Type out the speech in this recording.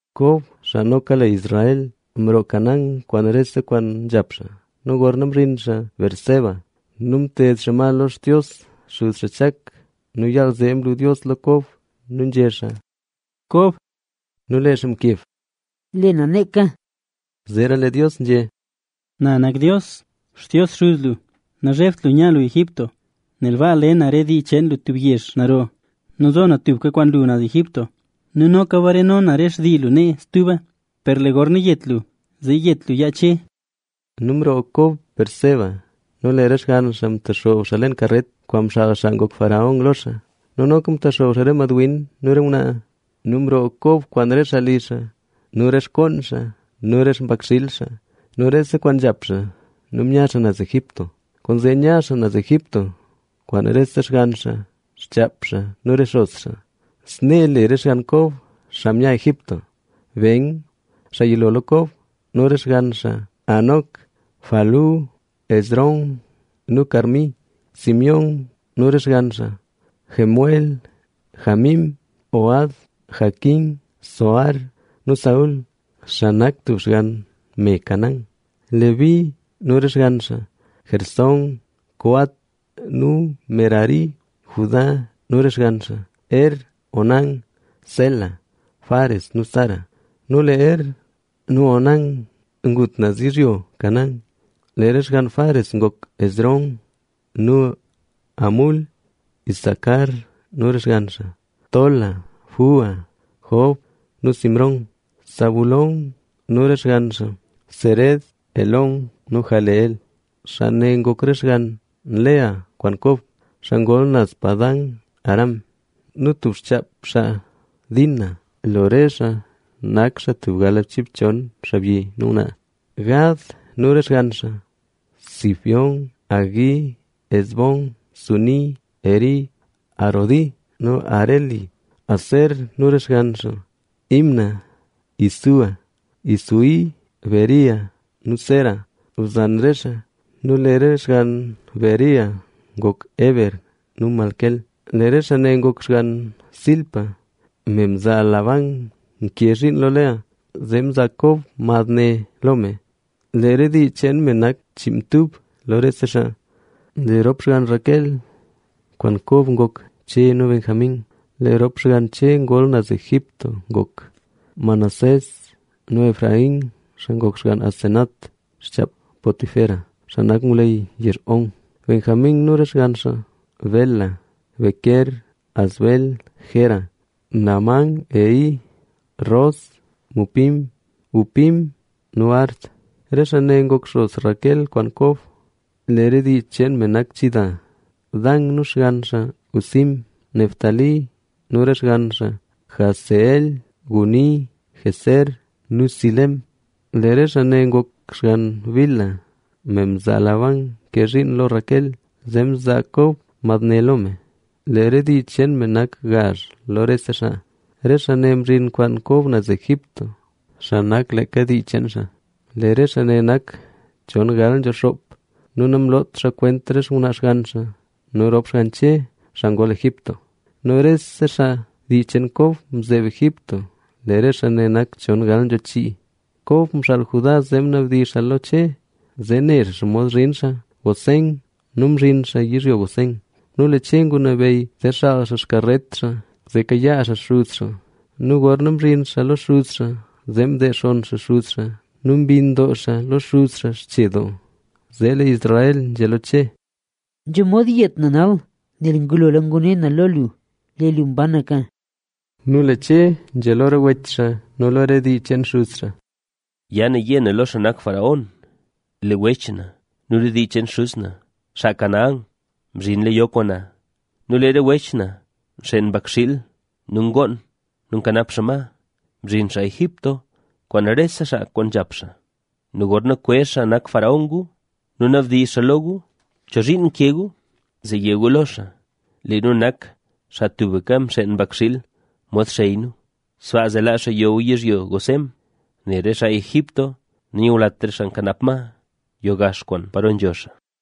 Kob, xaa noka le Israel, mroo Canaán kwaan rese kwaan nzhap xaa. Nu gorna mzhin xaa Beerseba nu mted xaa ma lo Xtios xuz xaa Chak. Nu yaal zee mlu Dios lo Kob nu nzhé xaa: —Kob. Nu lee xaa mkeb: —Lee na neeka. Zee lee Dios nzhé: —Na nak Dios, Xtios xuz lu. Nazhebt lu nya lu Egipto, nel baa le na re dii cheen lu tub yezh naro. Nu zo na tubka kwaan lu naz Egipto nu noka bareno na re xtii lu nee stuba. Per lee gorna yet lu, zee yet lu yaa Che. Nu mroo Kob Beerseba nu lee re xgann xaa mtexoob xaa leen karet, kwaan mxaal xaa ngok faraón lo xaa; nu noka mtexoob xaa re mad win nu re ngwnaa. Nu mroo Kob kwaan re li xaa nu re xkoon xaa nu re xpakxiil xaa nu rese kwaan nzhap xaa nu mya xaa naz Egipto. Kwaanzee mya xaa Egipto kwaan rese xgann xaa, xchaap xaa nu re xos xaa. Snee le re xgann Kob, xaa mya Egipto: Ben, xaa yilo lo Kob nu re xgann xaa: Hanoc, Falú, Hezrón nu Carmi. Simeón nu re xgann xaa: Jemuel, Jamín, Ohad, Jaquín, Zohar nu Saúl, xaa nak tub xgann me Canaán. Leví nu re xgann xaa: Gersón, Coat nu Merari. Judá nu re xgann xaa: Er, Onán, Sela, Fares nu Zara. (Nu lee Er nu Onán ngut naz yizhyo Canaán). Lee re xgann Fares ngok: Hezrón nu Hamul. Isacar nu re xgann xaa: Tola, Fúa, Job nu Simrón. Zabulón nu re xgann xaa: Sered, Elón nu Jahleel. Xaa ne ngok re xgann Lea kwaan Kob, xaa ngol naz Padan-aram nu tub xchaap xaa Dina. Lo re xaa nak xaa tub galbchiibchon, xaabyi nu ngwnaa. Gad nu re xgann xaa: Zifión, Hagui, Ezbón, Suni, Eri, Arodi nu Areli. Aser nu re xgann xaa: Imna, Isúa, Isúi, Bería nu Sera, bzan re xaa. Nu lee re xgann Bería ngok: Heber nu Malquiel. Lee re xaa ne ngok xgann Zilpa, me mzaa Labán nke zhiin lo Lea, zee mzaa Kob mad ne lo me. Lee re dii cheen me nak chiinmtub lo rese xaa. Lee rop xgann Raquel kwaan Kob ngok: Che nu Benjamín. Nu lee rop xgann Che ngol naz Egipto ngok: Manasés nu Efraín, xaa ngok xgann Asenat, xchaap Potifera, xaa nak ngwleyy yezh On. Benjamín nu re xgann xaa: Bela, Bequer, Asbel, Gera, Naamán, Ehi, Ros, Mupim, Hupim nu Ard. Re xaa ne ngok xos Raquel kwaan Kob. Lee re dii cheen me ne nak chida. Dan nu xgann xaa: Husim. Neftalí nu re xgann xaa: Jahzeel, Guni, Jezer nu Silem. Lee re xaa ne ngok xgann Bilha, me mzaa Labán nke zhiin lo Raquel, zee mzaa Kob mad ne lo me. Lee re dii cheen me nak gazh lo rese xaa. Re xaa ne mzhin kwaan Kob naz Egipto, xaa nak leeka dii cheen xaa. Lee re xaa nak chon gal nzho xoop nu namlot xaa kwent re xngwnaa xgann xaa. Nu rop xgann Che, xaa ngol Egipto nu rese xaa dii cheen Kob mzeeb Egipto, lee re xaa nak chon gal nzho chii. Kob mxaal Judá zee ngunabdizh xaa lo Che, zee ne xaa xomod zhin xaa Gosén. Nu mzhin xaa yizhyo Gosén. Nu lee Che ngunabeyy, zee xaal xaa xkaret xaa, zee kayaa xaa xuz xaa. Nu gorna mzhin xaa lo xuz xaa, zee mdeexonn xaa xuz xaa nu mbinn doo xaa lo xuz xaa xche doo. Zee lee Israel nzhé lo Che: —Nzho mod yet na nal, nel ngulola ngune na lo lu. ¡Lee lu mbanaka! Nu lee Che nzhé lo re wech xaa nu lo re dii cheen xuz xaa: —Ya na yé na lo xaa nak faraón: “Lee wech na nu re dii cheen xuz na, xaa Canaán, mzhinla yo kwaan na. Nu lee re wech na nxeen mbakxiil nu ngoon nu nkanap xaa ma. Mzhin xaa Egipto kwaan rese kwaan nzhap xaa”. Nu gorna kwezh xaa nak faraón gu nu nabdizh xaa lo gu: “¿Cho zhiin nke gu?” Zee yé gu lo xaa: “Lee nu nak xaa tubka mxeen mbakxiil mod xey nu”. Sbaa zee laa xaa yo gu yizhyo Gosén, nel re xaa Egipto nanyulat re xaa nkanap ma, yo gax kwaan paro nzho xaa.